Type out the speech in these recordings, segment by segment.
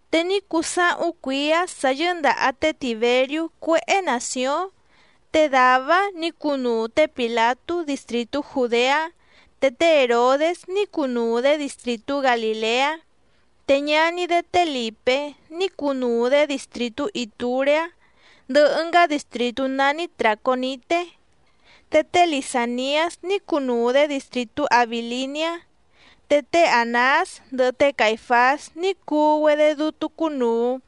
Te ní cuu sáhúⁿ cuíá sǎ yɨ́ndàha té Tìberiú cuéhé nàcióⁿ, te dàvá‑áⁿ nǐ cunuu té Pìlatú distrìtú Jùdeá, te té Hèrodés ní cunuu‑dě distrìtú Galìleá, te ñaní‑dé té Lìpé ní cunuu‑dě distrìtú Itùreá ndɨhɨ ɨngá distrìtú nání Tràconité, te té Lisàniás ní cunuu‑dě distrìtú Abìliniá. Te té Ànás ndɨhɨ té Caìfás ní cuu‑güedé dútú cúnùu.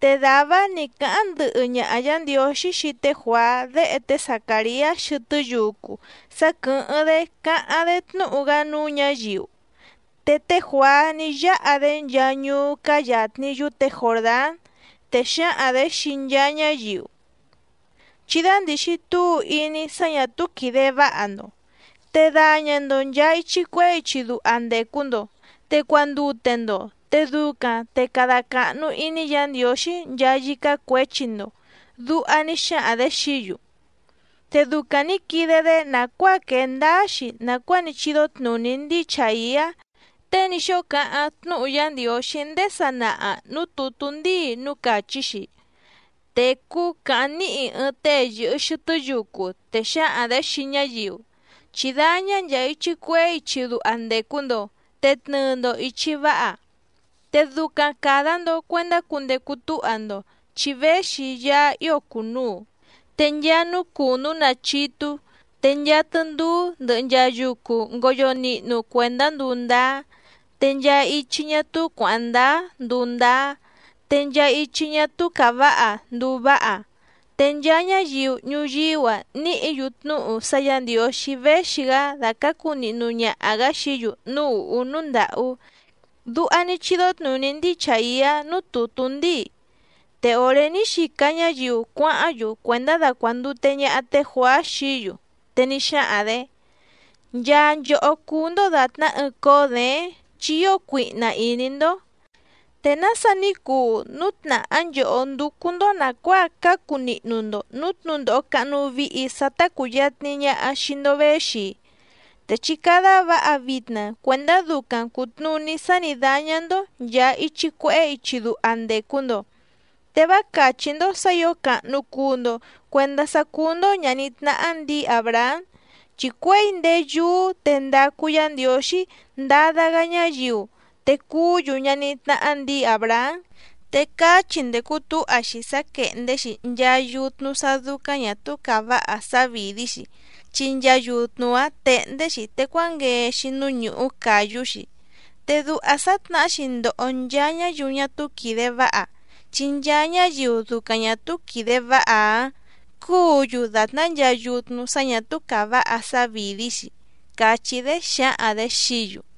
Te dàvá‑áⁿ nǐ cáháⁿ ndɨhɨ ñaha Yǎ Ndiǒxí xii té Juàá déhe té Zacàriá xɨtɨ́ yucu sá quɨ̀hɨ́ⁿ‑dé cáháⁿ‑dé tnúhu‑gá núú ñǎyiu. Te té Juàá ní yáha‑dé nchaa ñuú cáá yàtni yúte Jòrdán, te xǎhaⁿ‑dě xii nchaa ñáyiu: —Chí dándìxi túu iní sá ñà túú quìde váha‑ndo, te daña‑ndo nchàa ichi cuehé ichi duha ndècu‑ndo, te cuandute‑ndo, te ducaⁿ te cada càhnu iní Yǎ Ndiǒxí nchaa yícá cuěchi‑ndo —duha ní xáhaⁿ‑dě xií‑yu. Te ducaⁿ nǐ quide‑dé chi ní quee ndáá‑xi nàcuáa ní chídó tnùní ndíi Chàiá tée ní xóo cáháⁿ tnúhu Yá Ndiǒxí ndéé sanaha nǔú tùtú ndíi núú càchí‑xi: Tècú càháⁿ níhi ɨɨⁿ tée yɨ̀hɨ xɨtɨ́ yucu, te xǎhaⁿ‑dě xii ñáyiu: “Chí dáñá nchàa ichi cuehé ichi duha ndècu‑ndo, te tnɨɨ‑ndo ìchi váha, te ducaⁿ càda‑ndo cuendá cundecu túha‑ndo, chi véxi Yaá ío cùnuu. Te nchaa núú cùnú nachítú, te nchaa tɨndúú ndɨhɨ nchaa yucu ngoyo nihnu cuèndá nduu ndáá, te nchaa ichi ñá túú cuǎháⁿ ndáá nduu ndáá, te nchaa ichi ñá túú càváha nduu váha. Te nchaa ñáyiu ñuyíú‑a níhǐ‑yu tnúhu sá Yǎ Ndiǒxí véxi‑gá dàcácu nihnu ñaha‑gǎ xií‑yu núú ùhú núú ndàhú.” Duha ní chídó tnùní ndíi Chàiá núú tùtú ndíi. Te òré ní xica ñáyiu cuáháⁿ‑yu cuèndá dacuàndute ñaha té Juàá xií‑yu, te ní xáhaⁿ‑dě: —¡Nchaa nchòhó cúú‑ndó dàtná ɨɨⁿ cóó děéⁿ chi ío cuihna ìní‑ndó! ¿Te nása ní cuu núu tnàhá nchòhó ndúcú‑ndó nàcuáa cácu nihnu‑ndo nǔú tnǔndòho cahnu vihi sá tá cùyatni ñaha xii‑ndo véxi‑i? Te chí cádá vǎha vitna cuèndá ducaⁿ cùtnuní sá nǐ dáñá‑ndó nchàa ichi cuehé ichi duha ndècu‑ndo. Te vá càchí‑ndó sǎ ǐo càhnu cuu‑ndo cuendá sá cúú‑ndó ñàní tnáhá ndǐi Àbrahám, chi cuěi ndéé yúú te ndacu Yá Ndiǒxí ndada‑gá ñáyiu te cuú‑yu ñaní tnáhá ndǐi Àbrahám. Te caá chi ndècu túha‑xi sá quèhndé‑xi nchaa yutnu sá ñà túú càváha sávìdí‑xi, chi nchaa yutnu‑áⁿ tèhndé‑xi te cuánguee‑xi núú ñùhú càyú‑xi. Te duha sǎtnahá‑xi ndoho nchaa ñáyiu ñá túú quìde váha, chi nchaa ñáyiu ducaⁿ ñà túú quìde váha cùú‑yu dàtná nchaa yutnu sá ñà túú càváha sávìdí‑xi. —càchí‑dé xǎhaⁿ‑dě xií‑yu.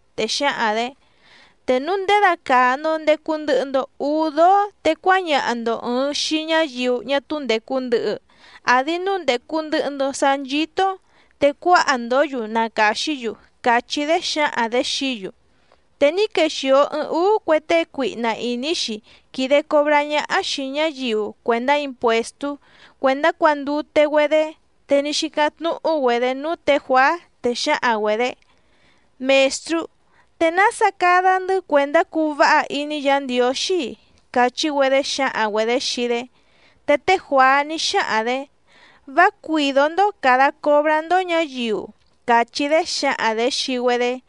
Te xǎhaⁿ‑dě: —Te núu ndědacàa‑ndo ndecu ndɨhɨ‑ndo úú dóó te cuáñaha‑ndo ɨ̀ɨⁿ xii ñáyiu ñá túú ndècu ndɨhɨ, àdi núu ndècu ndɨhɨ‑ndo sá nchító‑ó te cuáha‑ndǒ‑yu na càxí‑yu —càchí‑dé xǎhaⁿ‑dě xií‑yu. Te ní quexìo ɨɨⁿ úú cue tée cuihna ìní‑xi quìde cobrá ñáhá xìi ñáyiu cuèndá impuèstú cuèndá cuàndute‑güedé, te ní xícáⁿ tnúhu‑güedé núú tě Juàá, te xǎhaⁿ‑güedě: —Mèstrú, ¿te nása cada‑ndɨ́ cuèndá cuu váha iní Yǎ Ndiǒxí‑i? —càchí‑güedé xǎhaⁿ‑güedě xii‑dé. Te té Juàá ní xáhaⁿ‑dě: —Vá cuìdó‑ndó càda cobrá‑ndó ñǎyiu —càchí‑dé xǎhaⁿ‑dě xii‑güedé.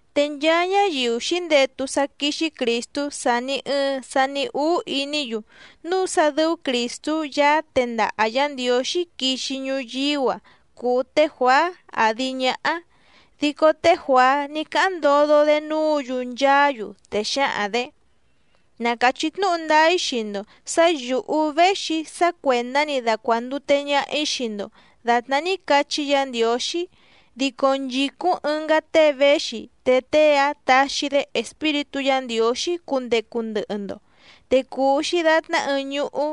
Te nchaa ñáyiu xǐndetu sá quíxí Crìstú sàni ɨɨⁿ sani úú iní‑yu núu sá dɨ́ú Crìstú Yaá tendaha Yǎ Ndiǒxí quixi ñuyíú‑a cùu te Juàá àdi ñáhá. Dico té Juàá ní cáháⁿ ndodo‑dé núǔ‑yu nchaá‑yu, te xǎhaⁿ‑dě: —Na càchí tnúhu ndáá‑í xii‑ndo sǎ yǔhú véxi‑í sá cuèndá‑ni dacuàndute ñaha‑í xii‑ndo dàtná ní cachí Yǎ Ndiǒxí, dico nchìcúⁿ ɨngá tée véxi, te tée‑áⁿ taxi‑dé Espíritú Yǎ Ndiǒxí cundecu ndɨhɨ‑ndo, te cùu‑xi datná ɨɨⁿ ñuhú,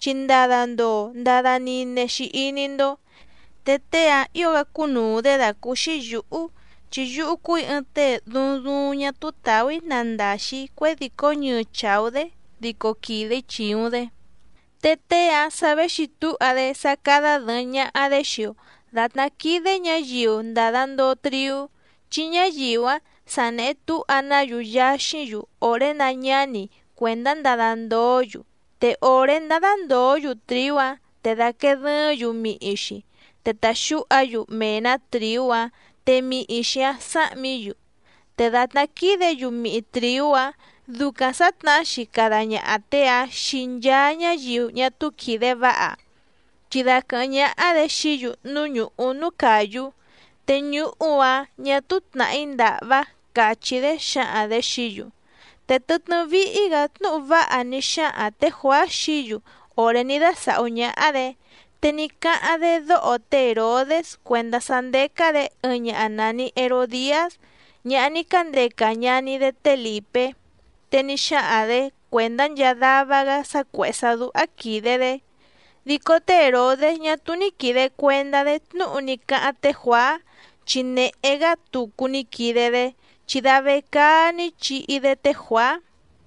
chi ndada ndoo ndada nine‑xi iní‑ndó. Te tée‑áⁿ ǐo‑gá cúnùu‑dé dàcúúxí yǔhú, chi yúhú cúù‑í ɨɨⁿ tée duuⁿ duuⁿ ñá túú tàú‑í nandaxi‑ǐ cuědìcó ñɨɨ chàú‑dé dico quìde‑í chìuⁿ‑dé. Te tée‑áⁿ sa véxi túha‑dé sá cádá dɨ̀ɨⁿ ñaha‑dé xii‑o dàtná quídé ñǎyiu ndàda ndoo triú, chi ñáyiu‑áⁿ sa nèhe túha‑ná‑yu yaxíⁿ‑yu òré náñǎni cuèndá ndada ndoó‑yu, te òré ndádá ndòó‑yu trìú‑áⁿ te dàquee dɨɨ́ⁿ‑yu mihi‑xi, te tàxúha‑yu mee‑nǎ trìú‑áⁿ, te mihi‑xi‑áⁿ sáhmǐ‑yu. Te dàtná quídě‑yu mihi trìú‑áⁿ ducaⁿ sǎtnahá‑xi cada ñaha tée‑áⁿ xii nchaa ñáyiu ñá túú quìde váha, chi daquɨ̀hɨ́ⁿ ñáhá‑dě xií‑yu núú ñùhú núú càyú, te ñuhú‑áⁿ ñà túú tnàhí ndàhvá —càchí‑dé xǎhaⁿ‑dě xií‑yu. Te tɨtnɨ́ víhí‑gǎ tnúhu váha ní xáhaⁿ tě Juàá xií‑yu òré ní dásàhú ñáhá‑dě. Te ní cáháⁿ‑dé dóho té Hèrodés cuèndá sá ndécá‑dě ɨɨⁿ ñaha nàni Herodiás ñaha ní cándeca ñaní‑dé té Lìpé, te ní xáhaⁿ‑dě cuèndá nchaa dava‑gá sá cuèhé sá dúhá quìde‑dé. Dico té Hèrodés ñá túú ní quìde cuendá‑dé tnúhu ní cáháⁿ té Juàá, chi nèhé‑gá tucu ní quide‑dé, chi da vecaá ní chihi‑dé té Juàá.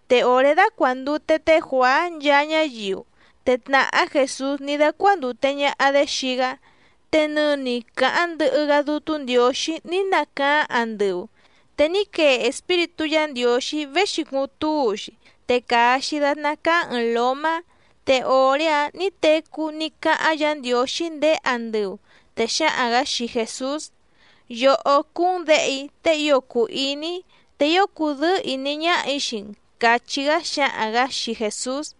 Te òré dácuàndute té Juàá nchaa ñáyiu, te tnàhá Jèsús ní dácuándùte ñaha‑dé xii‑gá. Te nɨni càháⁿ ndɨhɨ‑gá Dútú Ndiǒxí ní nacaáⁿ andɨu, te ní quee Espíritú Yǎ Ndiǒxí véxi cuuⁿ túu‑xi, te càa‑xi datná cáá ɨ̀ɨⁿ lómá, te òré‑áⁿ nǐ tecú ní cáháⁿ Yǎ Ndiǒxí ndéé andɨu, te xǎhaⁿ‑gǎ xii Jèsús: —Yòhó cúú‑n Děhe‑í tée ío cùu iní‑í, te ío cùdɨ́ɨ́ ìní ñáhà‑í xii‑n —càchí‑gá xǎhaⁿ‑gǎ xii Jèsús.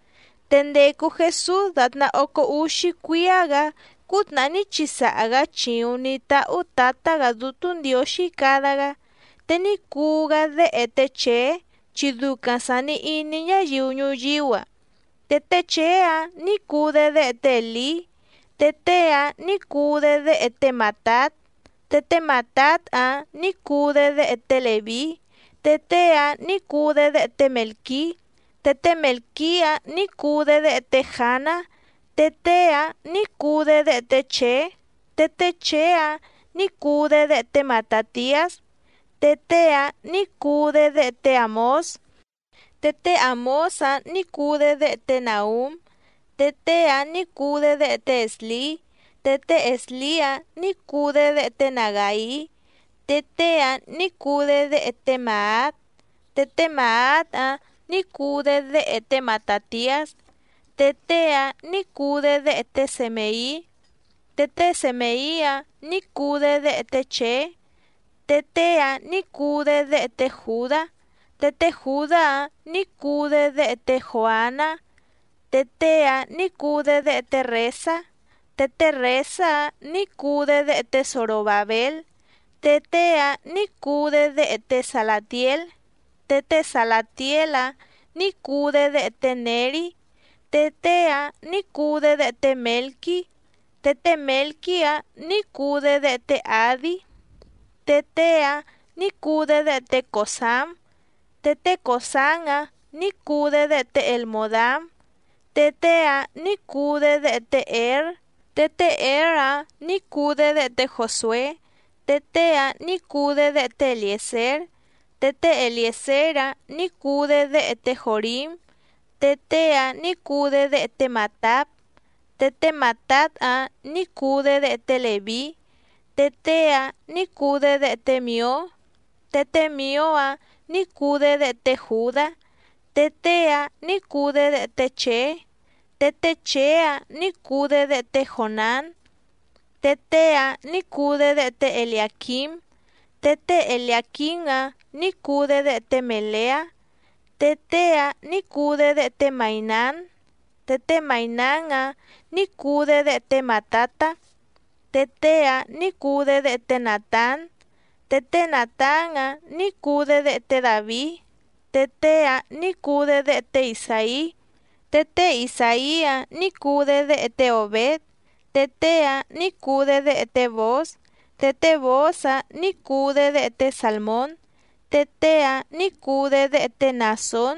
Te ndècu Jesús dàtná ócó úxí cuíá‑gǎ cútnàhá ní chisaha‑gǎ chìuⁿ ní táhú Tǎtá‑gǎ Dútú Ndiǒxí cada‑gá. Te ní cuu‑gá déhe té Chèé chi ducaⁿ sàni iní ñáyiu ñuyíú‑a. Te té Chèé‑áⁿ nǐ cuu‑dé déhe té Èlí, te tée‑áⁿ nǐ cuu‑dé déhe té Màtát. Te té Màtát‑áⁿ nǐ cuu‑dé déhe té Lèví, te tée‑áⁿ nǐ cuu‑dé déhe té Mèlquí. Te té Mèlquí‑áⁿ nǐ cuu‑dé déhe té Jàná, te tée‑áⁿ nǐ cuu‑dé déhe té Chèé. Te té Chèé‑áⁿ nǐ cuu‑dé déhe té Matàtiás, te tée‑áⁿ nǐ cuu‑dé déhe té Àmós. Te té Àmós‑áⁿ nǐ cuu‑dé déhe té Nàhúm, te tée‑áⁿ nǐ cuu‑dé déhe té Èslí. Te té Èslí‑áⁿ nǐ cuu‑dé déhe té Nagàí, te tée‑áⁿ nǐ cuu‑dé déhe té Màát. Te té Màát‑áⁿ nǐ cuu‑dé déhe té Matàtiás, te tée‑áⁿ nǐ cuu‑dé déhe té Semèí. Te té Semèí‑áⁿ nǐ cuu‑dé déhe té Chèé, te tée‑áⁿ nǐ cuu‑dé déhe té Jùdá. Te té Jùdá‑áⁿ nǐ cuu‑dé déhe té Jòaná, té tée‑áⁿ nǐ cuu‑dé déhe té Rèsá. Te té Rèsá‑áⁿ nǐ cuu‑dé déhe té Zorobàbél, te tée‑áⁿ nǐ cuu‑dé déhe té Salàtiél. Te té Salàtiél‑áⁿ nǐ cuu‑dé déhe té Nèrí, te tée‑áⁿ nǐ cuu‑dé déhe té Mèlquí. Te té Mèlquí‑áⁿ nǐ cuu‑dé déhe té Àdí, te tée‑áⁿ nǐ cuu‑dé déhe té Còsám. Te té Còsám‑áⁿ nǐ cuu‑dé déhe té Elmòdám, te tée‑áⁿ nǐ cuu‑dé déhe té Ěr. Te té Ěr‑áⁿ nǐ cuu‑dé déhe té Jòsué, te tée‑áⁿ nǐ cuu‑dé déhe té Elièzér. Te té Elièzér‑áⁿ nǐ cuu‑dé déhe té Jòrím, te tée‑áⁿ nǐ cuu‑dé déhe té Màtát. Te té Màtát‑áⁿ nǐ cuu‑dé déhe té Lèví, te tée‑áⁿ nǐ cuu‑dé déhe té Mìó. Te té Mìó‑áⁿ nǐ cuu‑dé déhe té Jùdá, te tée‑áⁿ nǐ cuu‑dé déhe té Chèé. Te té Chèé‑áⁿ nǐ cuu‑dé déhe té Jònán, te tée‑áⁿ nǐ cuu‑dé déhe té Eliàquím. Te té Eliàquím‑áⁿ nǐ cuu‑dé déhe té Mèleá, te tée‑áⁿ nǐ cuu‑dé déhe té Maìnán. Te té Maìnán‑áⁿ nǐ cuu‑dé déhe té Màtatá, te tée‑áⁿ nǐ cuu‑dé déhe té Nàtán. Te té Nàtán‑áⁿ nǐ cuu‑dé déhe té Dàvií, te tée‑áⁿ nǐ cuu‑dé déhe té Isàí. Te té Isàí‑áⁿ nǐ cuu‑dé déhe té Òbéd, te tée‑áⁿ nǐ cuu‑dé déhe té Bòóz. Te té Bòóz‑áⁿ nǐ cuu‑dé déhe té Sàlmón, te tée‑áⁿ nǐ cuu‑dé déhe té Naàsón.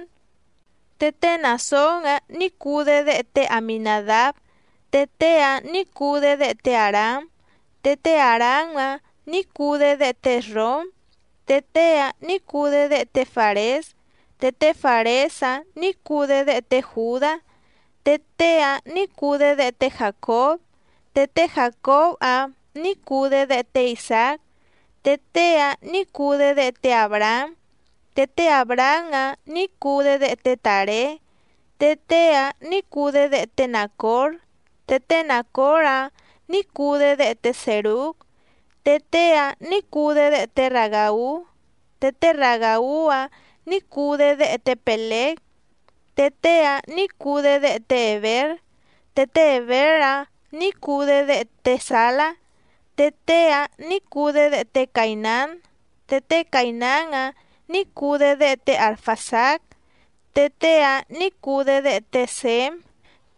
Te té Naàsón‑áⁿ nǐ cuu‑dé déhe té Aminàdáb, te tée‑áⁿ nǐ cuu‑dé déhe té Àrám. Te té Àrám‑áⁿ nǐ cuu‑dé déhe té Èsróm, te tée‑áⁿ nǐ cuu‑dé déhe té Fàrés. Te té Fàrés‑áⁿ nǐ cuu‑dé déhe té Jùdá, te tée‑áⁿ nǐ cuu‑dé déhe té Jàcób. Te té Jàcób‑áⁿ nǐ cuu‑dé déhe té Isàác, te tée‑áⁿ nǐ cuu‑dé déhe té Àbrahám. Te té Àbrahám‑áⁿ nǐ cuu‑dé déhe té Tàré, te tée‑áⁿ nǐ cuu‑dé déhe té Nàcór. Te té Nàcór‑áⁿ nǐ cuu‑dé déhe té Sèrúg, te tée‑áⁿ nǐ cuu‑dé déhe té Ragàú. Te té Ragàú‑áⁿ nǐ cuu‑dé déhe té Pèlég, te tée‑áⁿ nǐ cuu‑dé déhe té Hèbér. Te té Hèbér‑áⁿ nǐ cuu‑dé déhe té Sàlá, te tée‑áⁿ nǐ cuu‑dé déhe té Caìnán. Te té Caìnán‑áⁿ nǐ cuu‑dé déhe té Arfàxád, te tée‑áⁿ nǐ cuu‑dé déhe té Sěm.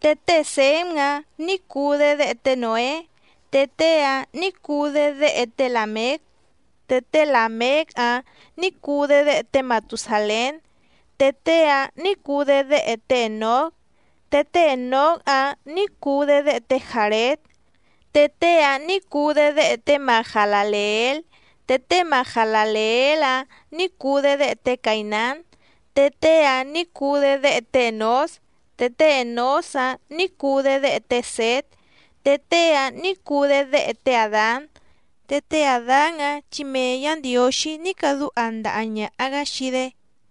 Te té Sěm‑áⁿ nǐ cuu‑dé déhe té Nǒé, te tée‑áⁿ nǐ cuu‑dé déhe té Làméc. Te té Làméc‑áⁿ nǐ cuu‑dé déhe té Matusàlén, te tée‑áⁿ nǐ cuu‑dé déhe té Ènóc. Te té Ènóc‑áⁿ nǐ cuu‑dé déhe té Jàréd, te tée‑áⁿ nǐ cuu‑dé déhe té Mahalàleél. Te té Mahalàleél‑áⁿ nǐ cuu‑dé déhe té Caìnán, te tée‑áⁿ nǐ cuu‑dé déhe té Ènós. Te té Ènós‑áⁿ nǐ cuu‑dé déhe té Sět, te tée‑áⁿ nǐ cuu‑dé déhe té Àdán. Te té Àdán‑áⁿ chi mee Yǎ Ndiǒxí ní cadúha ndaha ñàha‑gá xii‑dé.